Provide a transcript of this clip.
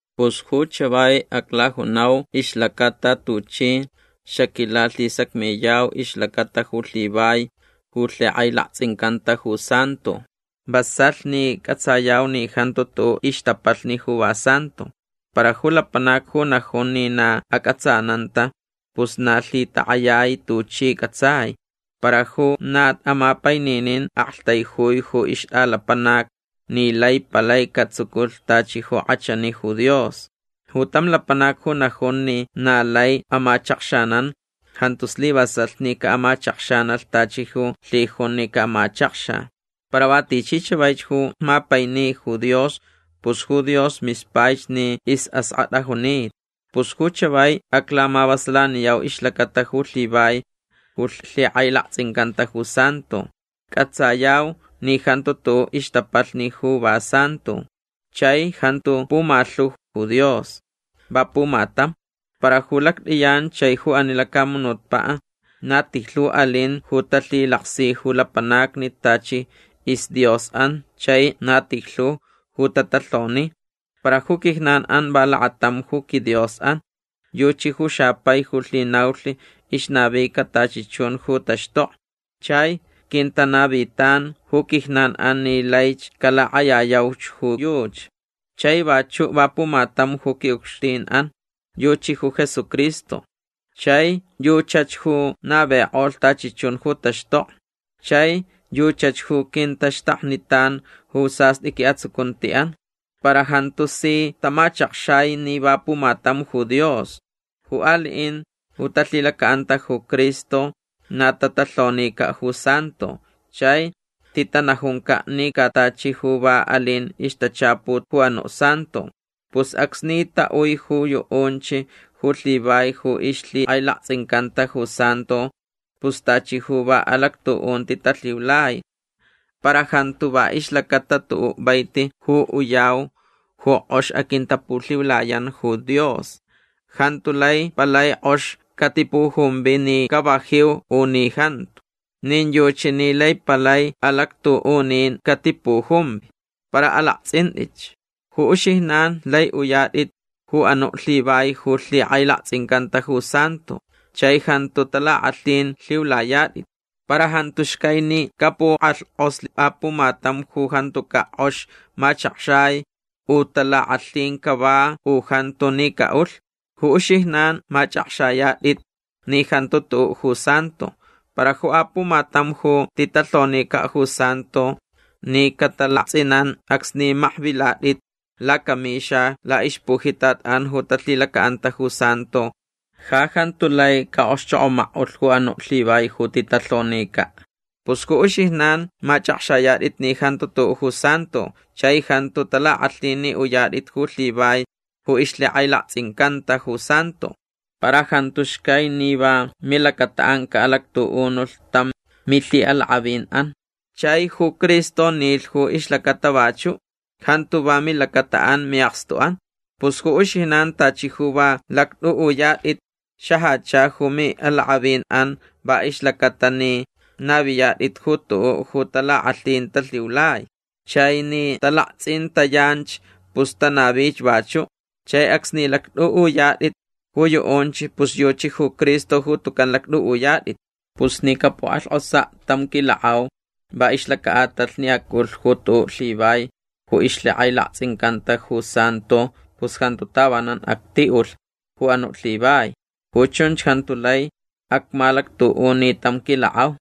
Pus ju chavai aclajunau ixlacata tuchi xaquilalhisacmiyau ixlacata ju lhivai ju lhikʼailaktsʼincanta ju santo. Vasalh ni cʼatsayau ni jantu tuʼuʼ ixtapalhni ju va santo. Para ju lapanac ju najun ni na acʼatsananta pus na lhitakʼayai tuchi cʼatsai. Para ju na amapaininin aktaijui ju ixtʼalapanac ni lai palai catsuculh tachi ju kʼachani ju Dios. Ju tam lapanac ju najun ni na lai amachakxanan jantu slivasalh ni caʼamachakxanalh tachi ju lhijunch ni camachakxa. Para va tichi chavaich ju mapaini ju Dios pus ju Dios mispaich ni isʼaskʼatʼa junita. Pus ju chavai aclamavasalaniyau ixlacata ju lhivai ju lhikʼailaktsʼincanta ju santo. Cʼatsayau ni jantu tuʼuʼ ixtapalhni ju va santo. Chai jantu pumalhu ju Dios. Va pumatam. Para ju lactʼiyan chai ju ani lacamunutpaʼ na tijlhu alin ju talhilaksi ju lapanacni tachi isdiosʼan chai na tijlhu ju tatalhoni. Para ju quijnanʼan va lakatam ju quiDiosʼan. Yuchi ju xapai ju lhinaulh ixnavica tachi chun ju taxtokni. Chai quintanavitan ju quijnanʼan ni laich calakʼayayauch ju yuchi. Chai vachuʼ va pumatam ju quiʼucxtinʼan. Yuchi ju Jesucristo. Chai yuchach ju navikʼolh tachi chun ju taxtokni. Chai yuchach ju quintaxtaknitan ju sastʼi quiʼatsucuntiʼan. Para jantu si tamachakxai ni va pumatam ju Dios. Ju aliʼin ju talhilacaʼanta ju Cristo na tatalhonicaʼ ju santo chai titanajuncaʼ ni ca tachi ju va alin ixtachaput ju anuʼ santo. Pus acsni taʼui ju yuʼunch ju lhivai ju ixlhikʼailaktsʼincanta ju santo pus tachi ju va alactuʼunti talhiulai. Para jantu va ixlacata tuʼuʼ vaiti ju uyau ju kʼox aquintapulhiulayan ju Dios. Jantu lai palai kʼox catipujumvi ni cavajiu u ni jantu. Nin yuchi ni lai palai alactuʼunin catipujumvi. Para alaktsʼintʼitch. Ju uxijnan lai uyatʼit ju anuʼ lhivai ju lhikʼailaktsʼincanta ju santo chai jantu talakʼalhin lhiulayatʼit. Para jantu xcai ni capukʼalhkʼoslh apumatam ju jantucaʼ kʼox machakxai u talakʼalhin cava u jantu ni caʼulh. Ju uxijnan machʼakxayatʼit ni jantu tuʼuʼ ju santo. Para ju apumatam ju titalhonicaʼ ju santo ni catalaktsʼinan acsni makvilatʼit lacamixa laʼixpujitatʼan ju talhilacaʼanta ju santo ja jantu lai caʼokxchokʼomakʼulh ju anuʼ lhivai ju titalhonicaʼ. Pus ju uxijnan machʼakxayatʼit ni jantu tuʼuʼ ju santo chai jantu talakʼalhin ni uyatʼit ju lhivai ju ixlhikʼailaktsʼincanta ju santo. Para jantu xcai ni va milacataʼan caʼalactuʼunulh tam milhiʼalakʼavinʼan. Chai ju Cristo nilh ju ixlacata vachuʼ. Jantu va milacataʼan miʼakstuʼan. Pus ju uxijnan tachi ju va lactʼuʼuyatʼit xajacha ju miʼalakʼavinʼan va ixlacata ni naviyatʼit ju tuʼuʼ ju talakʼalhin talhiulai. Chai ni talaktsʼintayanch pus tanavich vachuʼ. Chai acsni lactʼuʼuyatʼit ju yuʼunch pus yuchi ju Cristo ju tucan lactʼuʼuyatʼit. Pus ni capukʼalhkʼosaʼ tam quilakʼau va ixlacaʼatalh ni acʼulh ju tuʼuʼ lhivai ju ixlhikʼailaktsʼincanta ju santo pus jantu tavanan actiʼulh ju anuʼ lhivai. Ju chunch jantu lai acmalactuʼuni tam quilakʼau.